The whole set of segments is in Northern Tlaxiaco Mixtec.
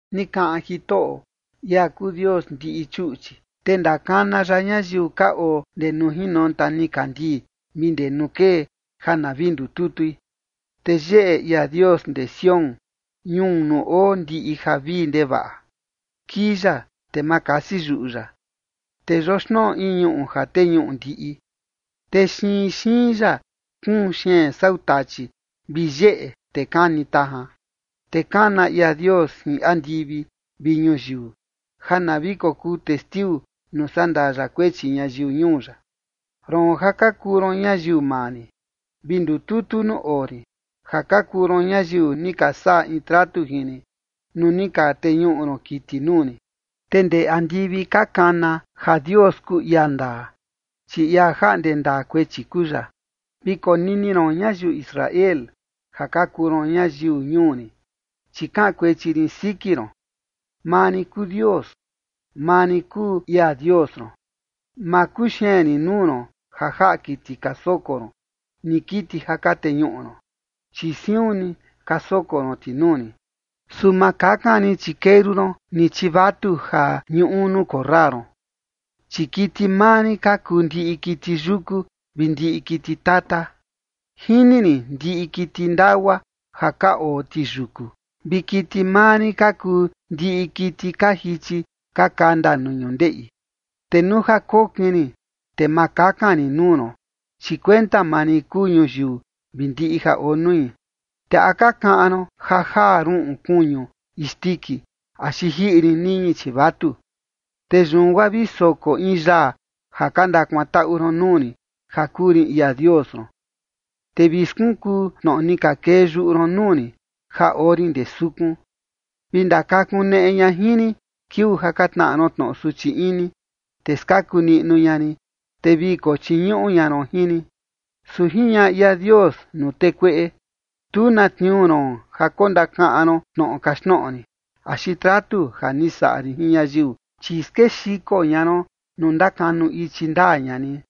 Ni kaꞌan Jitoꞌo, ia kuu Dios ndiꞌi chuꞌchi, te ndakana ya ñayiu ka oo ndee nuu jinonta nikandii vi ndee nuu kee, ja na vi ndututui. Te yeꞌe ia Dios ndee Sión, ñuu nuu oo ndiꞌi javii ndevaꞌa. Kii ya, te ma kasi yuꞌu ya, te yoxnoꞌo in ñuꞌu ja teñuꞌu ndiꞌi, te xiin xiin ya kuun xeen sau tachi vi yeꞌe te kani tajan. Te kana ña ia Dios jin andivi vi ñuyiu ja na vi kokuu testiu nuu sandaa ya kuechi ñayiu ñuu ya. “Roon ja ka kuu ron ñayiu maa rin, vi ndututu nuu oo rin, ja ka kuu ron ñayiu ni ka saꞌa in tratu jin rin nuu ni ka teñuꞌu ron kiti nuu rin”. Te ndee andivi ka kana, ja Dios kuu ia ndaa, chi ia jaꞌnde ndaa kuechi kuu ya. “Vi konini ron, ñayiu Israel, ja ka kuu ron ñayiu ñuu rin, chi kaꞌan kuechi rin siki ron. Maa rin kuu Dios, maa rin kuu ia Dios ron. Ma kuxeen rin nuu ron ja jaꞌa kiti ka soko ron, ni kiti ja ka teñuꞌu ron, chi siun ni ka soko ron ti nuu rin. Su ma kakan rin chikeru ron, ni chivatu ja ñuꞌu nuu korra ron, chi kiti maa rin ka kuu ndiꞌi kiti yuku vi ndiꞌi kiti tata. Jini rin ndiꞌi kiti ndagua ja ka oo ti yuku, vi kiti maa rin ka kuu ndiꞌi kiti ka jichi ka kanda nuu ñundeꞌi. Te nuu ja kokin rin, te ma kakan rin nuu ron, chi kuenta maa rin kuu ñuyiu vi ndiꞌi ja oo nui. ¿Te a ka kaꞌan ron ja jaa ruꞌun kuñu isndiki axi jiꞌi rin niñi chivatu? Te yun guaa vi soko in yaa ja ka ndakuantaꞌu ron nuu rin ja kuu rin ia Dios ron, te vi skunkuu tnoꞌo ni ka kee yuꞌu ron nuu rin ja oo rin ndee sukun. Vi ndakakuneꞌe ña jin rin kiuu ja ka tnaꞌa ron tnoꞌo suchi ini, te skaku niꞌnu ña rin, te vi kochiñuꞌu ña ron jin rin.” Su jiñaꞌa ia Dios nuu tee kueꞌe: “Tu na tniuu ron ja kondakaꞌan ron tnoꞌo kaxtnoꞌo rin, axi tratu ja ni saꞌa rin jin ñayiu. Chi skexiko ña ron nuu ndakanu ichi ndaa ña rin,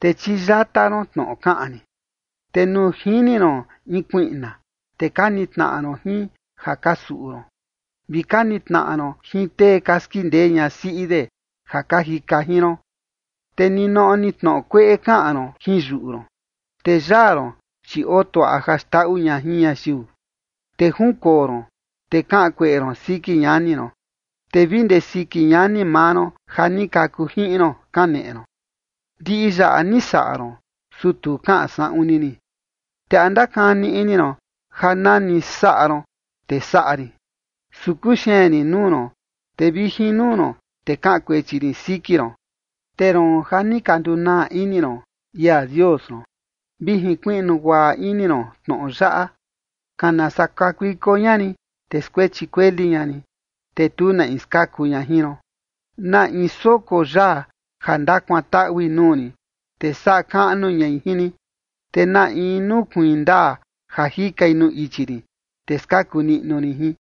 te chiyata ron tnoꞌo kaꞌan rin. Te nuu jini ron in kuiꞌna, te ka nitnaꞌa ron jin ja ka suꞌu ron, vi ka nitnaꞌa ron jin tee ka skindee ñasiꞌi de, ja ka jika jin ron. Te ninoꞌo ni tnoꞌo kueꞌe kaꞌan ron jin yuꞌu ron, te yaa ron, chi oo tuaꞌa ja xndaꞌu ña jin ñayiu. Te junkoo ron, te kaꞌan kueꞌe ron siki ñani ron, te vi ndee siki ñani maa ron ja ni kaku jiꞌin ron, kaneꞌe ron. Ndiꞌi yaꞌa ni saꞌa ron, su tu kaꞌan saꞌun ni rin, te ¿a ndakani ini ron ja nani saꞌa ron te saꞌa rin? Su kuxeen rin nuu ron, te vi jin nuu ron, te kaꞌan kuechi rin siki ron. ’Te roon ja ni ka ndunaa ini ron ia Dios ron, vi jinkuiꞌnu guaꞌa ini ron tnoꞌo yaꞌa. Kana saa kakuiko ña rin, te skuechi kueli ña rin, te tu na in skaku ña jin ron. Na in soko yaa ja ndakuantaꞌui nuu rin, te saꞌa kaꞌnu ñai jin rin. Te na in nukuiin ndaa ja jikai nuu ichi rin, te skaku niꞌnu rin jin.”